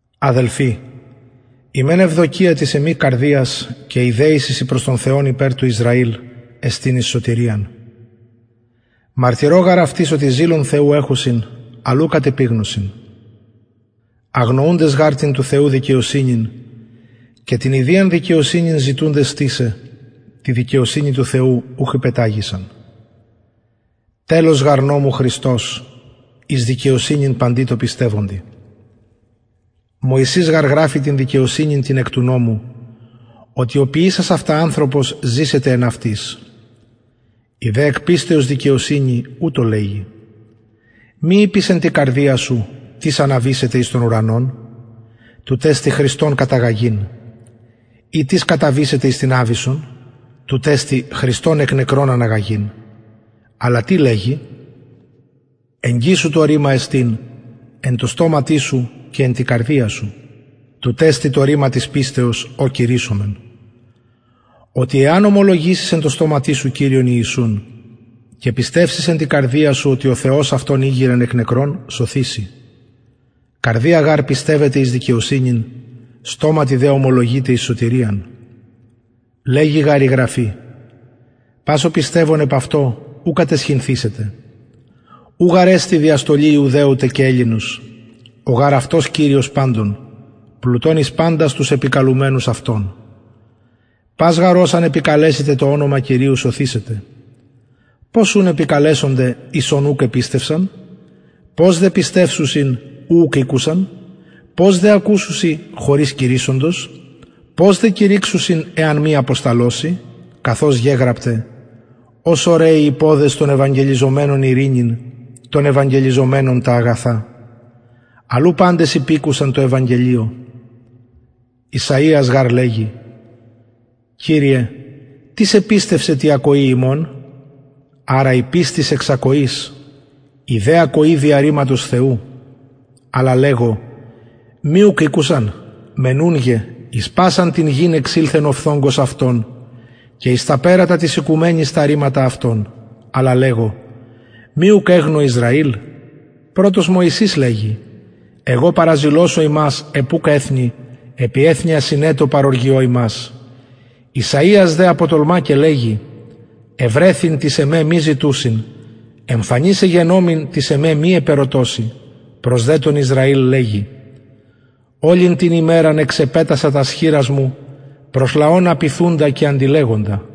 αδελφοι η μεν ευδοκια της εμης καρδιας και η δεησις η προς τον θεον υπερ του ισραηλ εστιν εις σωτηριαν μαρτυρω γαρ αυτοις οτι ζηλον θεου εχουσιν αλλ ου κατ επιγνωσιν αγνοουντες γαρ την του θεου δικαιοσυνην και την ιδιαν δικαιοσυνην ζητουντες στησαι τη δικαιοσυνη του θεου ουχ υπεταγησαν τελος γαρ νομου χριστος εις δικαιοσυνην παντι τω πιστευοντι μωυσης γαρ γραφει την δικαιοσυνην την εκ του νομου οτι ο ποιησας αυτα ανθρωπος ζησεται εν αυτοις η δε εκ πιστεως δικαιοσυνη ουτως λεγει μη ειπης εν τη καρδια σου τις αναβησεται εις τον ουρανον τουτ εστιν χριστον καταγαγειν η τις καταβησεται εις την αβυσσον τουτ εστιν χριστον εκ νεκρων αναγαγειν αλλα τι λεγει εγγυς σου το ρημα εστιν εν τω στοματι σου και εν τη καρδια σου τουτ εστιν το ρημα της πιστεως ο κηρυσσομεν οτι εαν ομολογησης εν τω στοματι σου κυριον ιησουν και πιστευσης εν τη καρδια σου οτι ο θεος αυτον ηγειρεν εκ νεκρων σωθηση καρδια γαρ πιστευεται εις δικαιοσυνην στοματι δε ομολογειται εις σωτηριαν λεγει γαρ η γραφη πας ο πιστευων επ αυτω ου καταισχυνθησεται ου γαρ εστιν διαστολη ιουδαιου τε και ελληνος ο γαρ αυτος κυριος παντων πλουτων εις παντας τους επικαλουμενους αυτον πας γαρ ος αν επικαλεσηται το ονομα κυριου σωθησεται πως ουν επικαλεσονται εις ον ουκ επιστευσαν πως δε πιστευσουσιν ου ουκ ηκουσαν πως δε ακουσουσιν χωρις κηρυσσοντος πως δε κηρυξουσιν εαν μη αποσταλωσιν καθως γεγραπται ως ωραιοι οι ποδες των ευαγγελιζομενων ειρηνην των ευαγγελιζομενων τα αγαθα αλλ ου παντες υπηκουσαν τω ευαγγελιω ησαιας γαρ λεγει κυριε τις επιστευσεν τη ακοη ημων αρα η πιστις εξ ακοης η δε ακοη δια ρηματος θεου αλλα λεγω μη ουκ ηκουσαν μενουνγε εις πασαν την γην εξηλθεν ο φθογγος αυτων και εις τα περατα της οικουμενης τα ρηματα αυτων αλλα λεγω μη ουκ εγνω ισραηλ πρωτος μωυσης λεγει εγω παραζηλωσω υμας επ ουκ εθνει επι εθνει ασυνετω παροργιω υμας ησαιας δε αποτολμα και λεγει ευρεθην τοις εμε μη ζητουσιν εμφανης εγενομην τοις εμε μη επερωτωσιν προς δε τον ισραηλ λεγει ολην την ημεραν εξεπετασα τας χειρας μου προς λαον απειθουντα και αντιλεγοντα